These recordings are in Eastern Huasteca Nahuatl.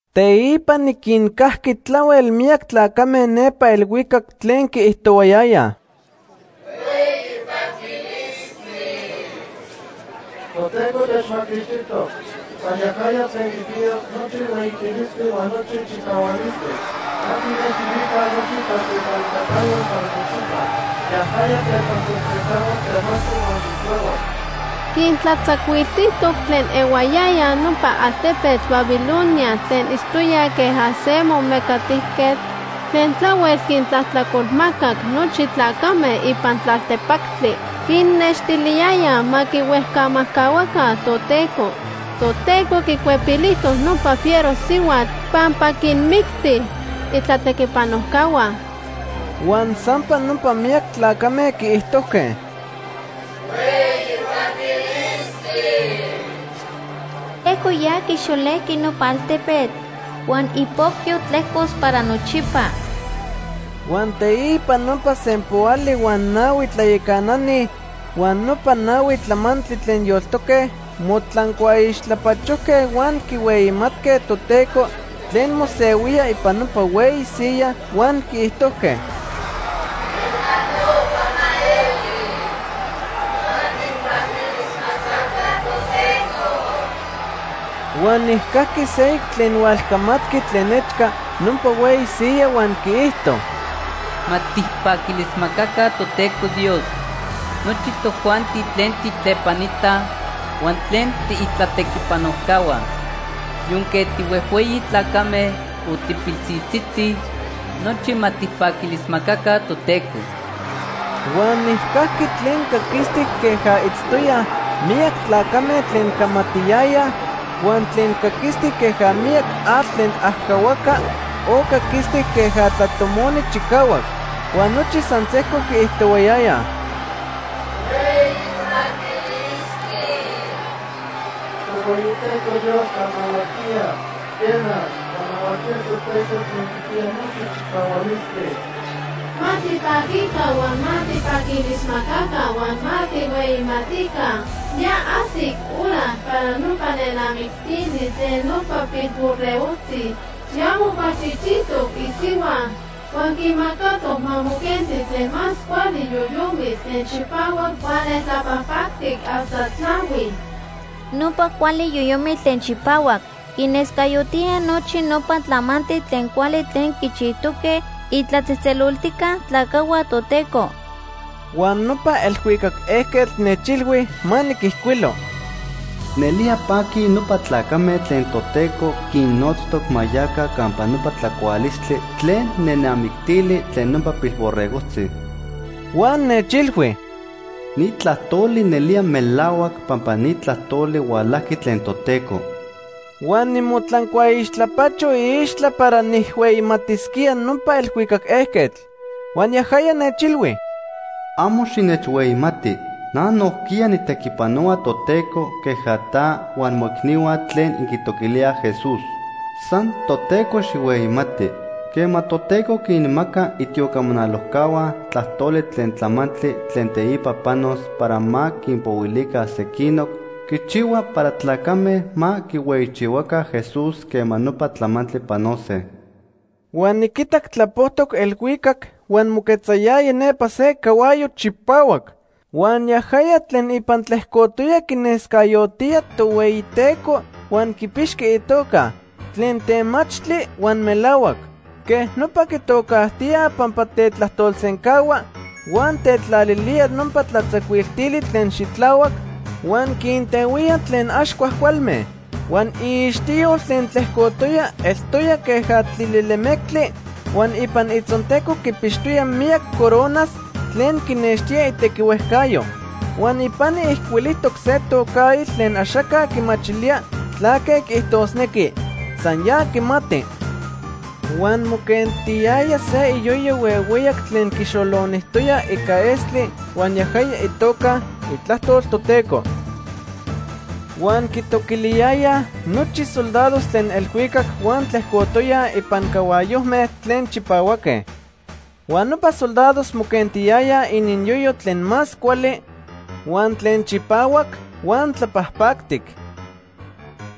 Teipa niquincajqui tlahuel miyac tlacame nepa elhuicac tlen quiijtohuayayaj: “¡Hueyi paquilistli! Toteco techmaquixtijtoc. San yajaya tlen quipiya nochi hueyitilistli huan nochi chicahualistli. Ma tijnextilica nochi tlatlepanitacayotl para nochipa. Yajaya tetlajtolsencahua temachtli huan xitlahuac. Quintlatzacuiltijtoc tlen ehuayayaj nopa altepetl Babilonia tlen itztoyaj queja se momecatijquetl tlen tlahuel quintlajtlacolmacac nochi tlacame ipan tlaltepactli. Quinnextiliyayaj ma quihuejcamajcahuaca Toteco. Toteco quicuepilijtoc nopa fiero sihuatl pampa quinmicti itlatequipanojcahua.” Huan sampa nopa miyac tlacame quiijtojque: “¡Hueyi paquilistli! Toteco ya quixolejqui nopa altepetl huan ipocyo tlejcos para nochipa.” Huan teipa nopa sempoali huan nahui tlayacanani huan nopa nahui tlamantli tlen yoltoque motlancuaixtlapachojque huan quihueyimatque Toteco tlen mosehuía ipan nopa hueyi siyaj huan quiijtojque: “¡Queja nopa ma eli! ¡Ma tijpaquilismacaca Toteco!” Huan nijcajqui seyoc tlen hualcamatqui tlen nechca nopa hueyi siyaj huan quiijto: “Ma tijpaquilismacaca Toteco Dios nochi tojuanti tlen tijtlepanitaj huan tlen tiitlatequipanojcahua. Yonque tihuejhueyi tlacame o tipilsiltzitzi, nochi ma tijpaquilismacaca Toteco.” Huan nijcajqui tlen caquistic queja itztoyaj miyac tlacame tlen camatiyayaj, huan tlen caquistic queja miyac atl tlen ajcahuaca, o caquistic queja tlatomoni chicahuac. Huan nochi san sejco quiijtohuayayaj: “¡Hueyi paquilistli! Tohueyiteco Dios tlanahuatía, Quena, tlanahuatía Toteco Tlen Quipiya Nochi Chicahualistli. Ma tipaquica huan ma tijpaquilismacaca huan ma tijhueyimatica. Ya ajsic hora para nopa nenamictili tlen nopa Pilborregojtzi. Ya mocualchijchijtoc isihua. Huan quimacatoc ma moquenti tlen más cuali yoyomitl tlen chipahuac huan neltlapajpactic hasta tlahui. Nopa cuali yoyomitl tlen chipahuac quinescayotía nochi nopa tlamantli tlen cuali tlen quichijtoque itlatzejtzeloltijca tlacajhua Toteco.” Huan nopa elhuicac ejquetl nechilhui ma niquijcuilo: “Nelía paquij nopa tlacame tlen Toteco quinnotztoc ma yaca campa nopa tlacualistli tlen nenamictili tlen nopa Pilborregojtzi.” Huan nechilhui: “Ni tlajtoli nelía melahuac pampa ni tlajtoli hualajqui tlen Toteco.” Huan nimotlancuaixtlapacho iixtla para nijhueyimatisquía nopa elhuicac ejquetl. Huan yajaya nechilhui: “Amo xinechhueyimati. Na nojquiya nijtequipanohua Toteco queja ta huan moicnihua tlen inquitoquilíaj Jesús. San Toteco xijhueyimati. Quema Toteco quinmaca itiocamanalojcahua tlajtoli tlen tlamantli tlen teipa panos para ma quinpohuilica sequinoc, quichihua para tlacame ma quihueyichihuaca Jesús quema nopa tlamantli panose.” Huan niquitac tlapojtoc elhuicac huan moquetzayaya nepa se cahuayo chipahuac. Huan yajaya tlen ipan tlejcotoya quinescayotía Tohueyiteco huan quipixqui itoca: Tlen Temachtli huan Melahuac. Quej nopa quitocajtíaj pampa tetlajtolsencahua huan tetlalilía nopa tlatzacuiltili tlen xitlahuac, huan quintehuía tlen ax cuajcualme. Huan iixtiyol tlen tlejcotoya eltoya queja tlilelemectli huan ipan itzonteco quipixtoya miyac coronas tlen quinextía itequihuejcayo. Huan ipani ijcuilijtoc se tocaitl tlen axaca quimachilía tlaque quiijtosnequi, san ya quimati. Huan moquentiyaya se iyoyo huehueyac tlen quixolonijtoya ica estli huan yajaya itoca: Itlajtol Toteco. Huan quitoquiliyayaj nochi soldados tlen elhuicac huan tlejcotoyaj ipan cahuayojme tlen chipahuaque. Huan nopa soldados moquentiyayaj ininyoyo tlen más cuali, huan tlen chipahuac huan tlapajpactic.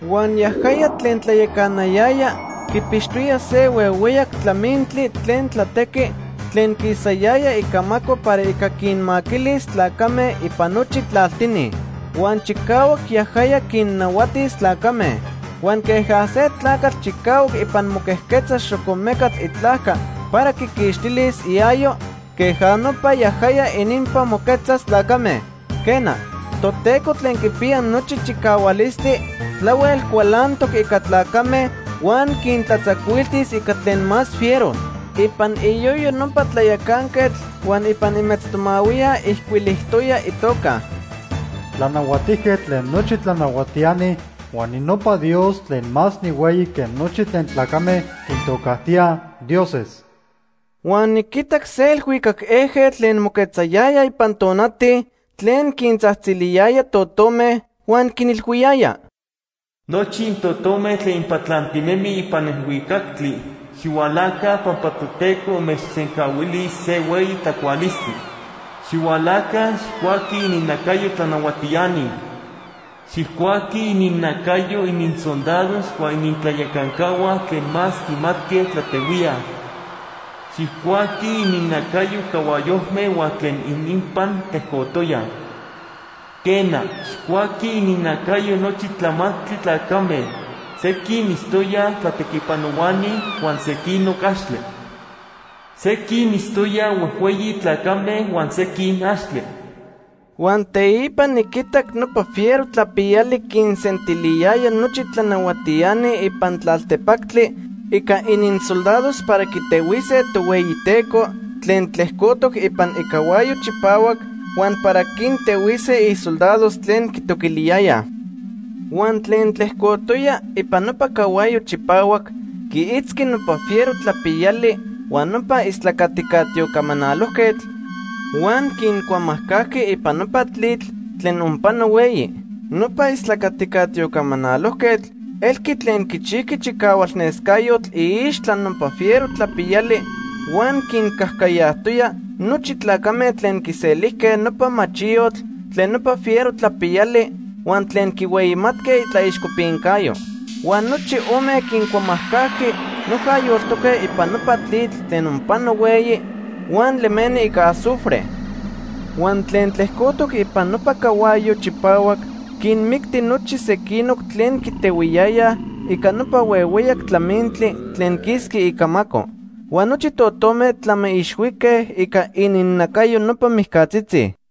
Huan yajaya tlen tlayacanayaya quipixtoya se huehueyac tlamintli tlen tlatequi tlen quisayaya icamaco para ica quinmaquilis tlacame ipan nochi tlaltini. Huan chicahuac yajaya quinnahuatis tlacame. Huan queja se tlacatl chicahuac ipan moquejquetza xocomecatl itlajca para quiquixtilis iayo, queja nopa yajaya ininpan moquejquetzas tlacame. Quena, Toteco Tlen Quipiya Nochi Chicahualistli tlahuel cualantoc ica tlacame huan quintlatzacuiltis ica tlen más fiero. Ipan iyoyo nopa tlayacanquetl huan ipan imetztomahuiya ijcuilijtoya itoca: “Tlanahuatijquetl tlen nochi tlanahuatiani huan ninopa Dios tlen más nihueyi que nochi tlen tlacame quintocajtíaj ‘dioses’.” Huan niquitac se elhuicac ejquetl tlen moquetzayaya ipan tonati tlen quintzajtziliyaya totome huan quinilhuiyaya: “Nochi intotome tlen inpatlantinemij ipan elhuicactli, xihualaca pampa Toteco inmechsencahuilis se hueyi tlacualistli. Xihualaca, xijcuaquij ininnacayo tlanahuatiani. Xijcuaquij ininnacayo ininsoldados huan inintlayacancahua tlen más quimatque tlatehuíaj. Xijcuaquij ininnacayo cahuayojme huan tlen ininpan tlejcotoyaj. Quena, xijcuaquij ininnacayo nochi tlamantli tlacame; sequin itztoyaj tlatequipanohuani huan sequinoc axtle. Sequin itztoyaj huejhueyi tlacame huan sequin axtle.” Huan teipa niquitac nopa fiero tlapiyali quinsentiliyaya nochi tlanahuatiani ipan tlaltepactli ica ininsoldados para quitehuise Tohueyiteco tlen tlejcotoc ipan icahuayo chipahuac huan para quintehuise isoldados tlen quitoquiliyayaj. Huan tlen tlejcotoya ipan nopa cahuayo chipahuac quiitzqui nopa fiero tlapiyali huan nopa istlacatica tiocamanalojquetl, huan quincuamajcajqui ipan nopa tlitl tlen onpano hueyi. Nopa istlacatica tiocamanalojquetl elqui tlen quichijqui chicahualnescayotl iixtla nopa fiero tlapiyali huan quincajcayajtoya nochi tlacame tlen quiselijque nopa machiyotl tlen nopa fiero tlapiyali huan tlen quihueyimatque itlaixcopincayo. Huan nochi ome quincuamajcajqui noja yoltoque ipan nopa tlitl tlen onpano hueyi huan lemeni ica azufre. Huan tlen tlejcotoc ipan nopa cahuayo chipahuac quinmicti nochi sequinoc tlen quitehuiyayaj ica nopa huehueyac tlamintli tlen quisqui icamaco. Huan nochi totome tlamiixhuique ica ininnacayo nopa mijcatzitzi.